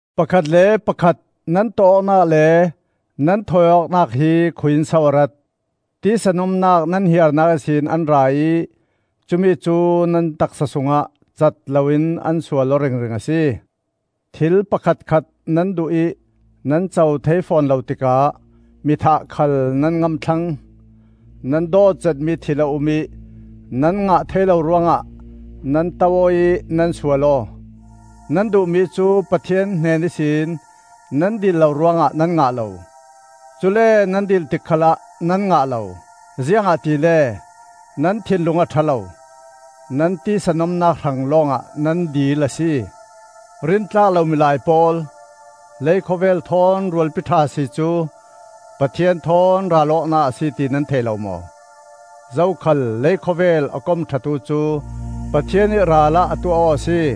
Pakhat le pakhat nan tawh awknak le nan thawi awknak hi khui-in so a rat? Tisa nomnak nan hiarnak ihsin an ra ih cumi cu nan taksa sungah cat loin an sual aw ringring a si. Thil pakhatkhat nan duh ih nan co thei fawn lo tikah mi thah khal nan ngam thlang; nan dawt zetmi thil a um ih nan ngah thei lo ruangah nan to aw ih nan sual aw. Nan duhmi cu Pathian hnen ihsin nan dil lo ruangah nan ngah lo. Cule nan dil tik khalah nan ngah lo, ziangahtile nan thinlung a ṭha lo; nan tisa nomnak hrang lawngah nan dil a si. Rintlak lo milai pawl! Leikhawvel thawn rualpi ṭha si cu Pathian thawn ral awknak a si ti nan thei lo maw? Zokhal leikhawvel a kom ṭhatu cu Pathian ih ralah a tuah aw a si.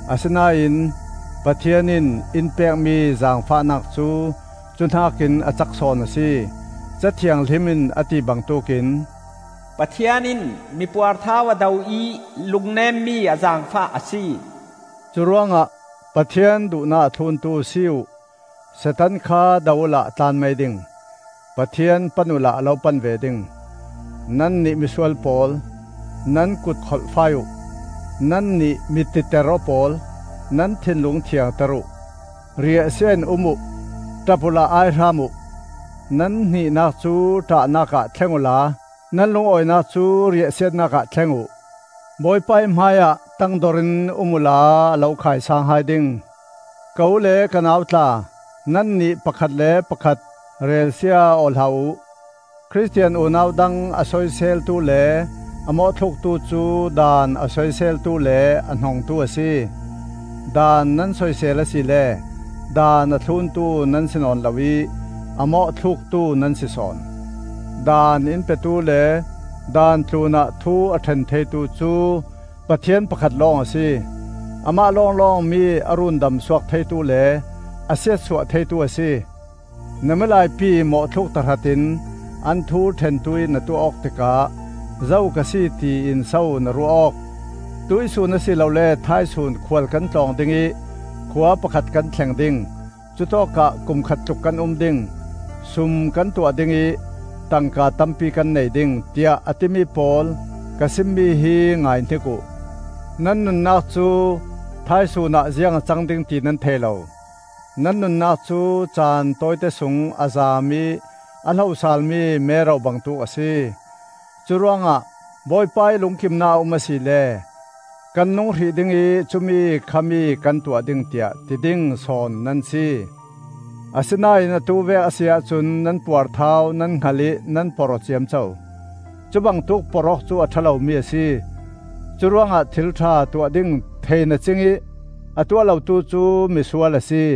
Asinain Pathian in in pekmi zaangfahnak cu cu hnakin a cak sawn a si. Ca Thianghlim in a ti bangtuk in, “Pathian in mi puarthau a do ih lungnemmi a zaangfah a si.” Curuangah Pathian duhnak a thluntu si uh. Satan kha do uhla a tlan mai ding. Pathian pan uhla a lo pan ve ding. Nannih misual pawl, nan kut kholhfai uh. Nannih mi-titer aw pawl, nan thinlung thiangter uh. Riahsia in um uh; ṭap uhla aihram uh. Nan hnih-nak cu ṭahnak ah thleng uhla nan lungawinak cu riahsiatnak ah thleng uh. Bawipa ih hmaiah tangdorin um uhla a lo khaisaang hai ding. Ka u le ka nau tla, nannih pakhat le pakhat relsia aw hlah uh. Khristian unau dang a soiseltu le a mawhthluktu cu Daan a soiseltu le a hnongtu a si. Daan nan soisel asile Daan a thluntu nan si nawn lo ih a mawhthluktu nan si sawn. Daan in petu le Daan tlunah thu a ṭhen theitu cu Pathian pakhat lawng a si. Amah lawnglawng mi a rundam suak theitu le a siatsuah theitu a si. Na milaipi mawhthluk tahratin an thu ṭhentu ih na tuah awk tikah zo ka si tiin so na ruah awk? “Tuihsun a si lole thaisun khual kan tlawng ding ih khua pakhat kan thleng ding; cutawkah kum khat tluk kan um ding, sum kan tuah ding ih tangka tampi kan nei ding,” tiah a timi pawl, ka simmi hi ngaihnik uh. Nan nunnak cu thaisun ah ziang a cang ding ti nan thei lo. Nan nunnak cu caan tawite sung a zaam ih a hlo saalmi mero bangtuk a si. Curuangah, “Bawipa ih lungkimnak a um asile kan nung hrih ding ih cumi, khami kan tuah ding,” tiah ti ding sawn nan si. Asinain atu vek a si ahcun nan puarthau nan hngal ih nan porh aw ciamco. Cubangtuk porh awk cu a ṭha lomi a si. Curuangah thil ṭha tuah ding thei na cingih a tuah lotu cu misual a si.